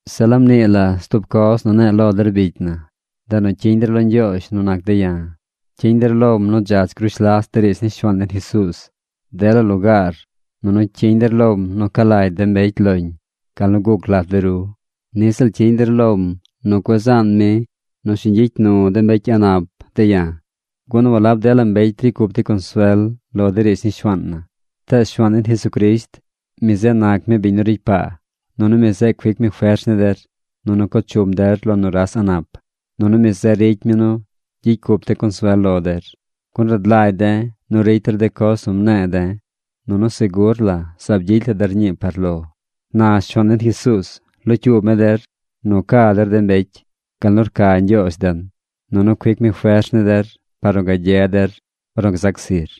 Zeꞌ laab nii la stub coz nu ne̱e̱ lo der bicy na, ndeꞌ nu cyiñ der lo Ñgyoozh nu nac de̱ ya̱. Cyiñ der lom nu dzach grush las de riidz ni Shuaan den Jesuuz dela lugaar nunu cyiñ der lom nu ca lagy de mbecy loñ gal nu guc lat de ru. Niꞌ ziꞌl cyiñ der lom nu cueꞌ zaan mi nu shiñ gyicy nu de mbecy a̱ꞌ nap de̱ ya̱. Gun walab dela mbecy ricy cup dey consuel lo de riidz ni Shuaan na. Tees Shuaan den Jesucrisht, mi zeꞌ nac mi biñ nu ricy paa. Nunu mi zeꞌ cuic mi fers ni der. Nunu co chum der lo nuras a̱ꞌ nap. Nunu mi zeꞌ ricy mi nu gyicy cup de̱ consuel lo der, gun rad lagy de̱ nu ricy der de coz nu mne̱e̱ de̱, nunu segur la zaab gyicy la der ñii par lo. Na Shuaan den Jesuuz locyuub mi der nu ca der de mbecy, gal nu rca Ñgyoozh den, nunu cuic mi fers ni der par nu gagye der ornu gzac zir.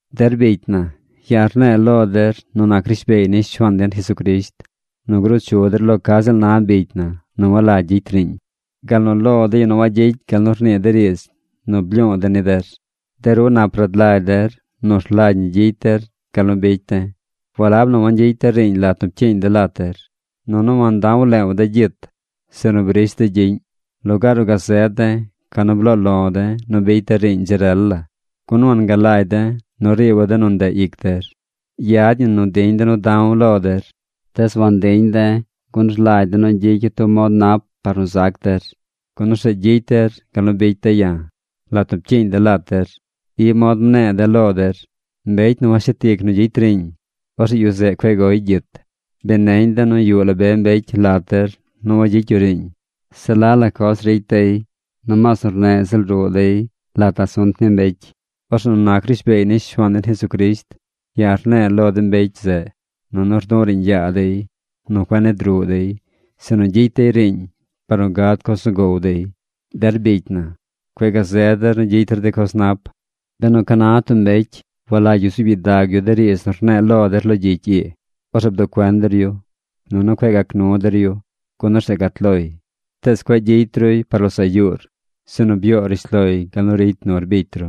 Der bicy na, ya̱ rne̱e̱ lo der nu nac rishbeey ni Shuaan den Jesucrisht nu gruu chu der lo ca ziꞌl na bicy na nu walagy gyicy riiñ, gal nu lo de yu nu wagyicy gal nu rnii de riidz nu blyu̱u̱ de̱ ni der. De ru nap rad lagy der nu rlagy ñi gyicy der gal nu bicy de̱. Walab nu wangyicy de̱ riiñ lat nu pcyiiñ de̱ lat der. Nunu wanta̱w leew de̱ gyit, sinu brish de̱ gyiꞌñ. Lugaar nu gazed de̱, ca nu bloo lo̱ de̱ nu bicy de̱ riiñ dzi rel la, gun wangalagy de̱ nu riiba̱ de nu ndeꞌ ic der. Yad ñi nu diñ de̱ nu da̱w lo der. Tees wantiñ de̱ gun rlagy de̱ nu gyicya̱ tub mod nap par nu zac der, gun orzeꞌ gyicy der gal nu bicy de̱ ya̱. Lat nu pcyiiñ de̱ lat der, i mod mne̱e̱ de̱ lo der: “Mbecy nu washet ic nu gyicy riiñ, orzeꞌ yu zeꞌ cueꞌ goy gyit.” Bi neñ de̱ nu yuꞌ la be mbecy lat der nu wagyicy yu riiñ. Se la la coz ricy dey. Nomaas nu rneꞌ ziꞌl ruꞌ dey lat asunt ni mbecy. Orzeꞌ nu nac rishbeey ni Shuaan den Jesucrisht, ya̱ rne̱e̱ lo de mbecy zeꞌ nunu rdu̱ꞌ riiñ yaa dey nu cueꞌ nid ruꞌ dey, sinu gyicy dey riiñ par nu gad coz nu gow dey. Der bicy na, cueꞌ gazed der nu gyicy der de coz nap. Benu ca na tub mbecy walagy yu zuub gyidag yu de riidz nu rne̱e̱ lo der lo gyicy ii, orzeꞌ bduꞌ cuen der yu, nunu cueꞌ gac nu der yu. Gun orzeꞌ gat loy. Tees cueꞌ gyicy ruy par losaꞌ yuur, sinu byoo rishloy gal nu ricy nur bicy ru.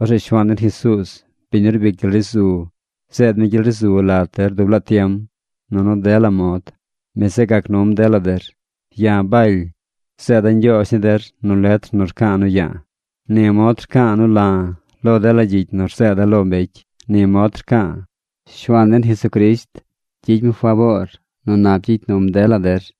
Orzeꞌ Shuaan den Jesuuz, biñ nu rbic gyel ri zu, zeed mi gyel ri zu lat der dub laa tiem nunu dela mod. Mi zeꞌ gac num dela der. Ya̱ Baly, zeeda̱ ñgyoozh ni der nu letr nu rca̱a̱ nu ya̱a̱. Ni mod rca̱a̱ nu la̱ lo dela gyicy nu rzeeda̱ lo mbecy. Ni mod rca̱a̱. Shuaan den Jesucrisht gyicy mi faboor nu nap gyicy num dela der.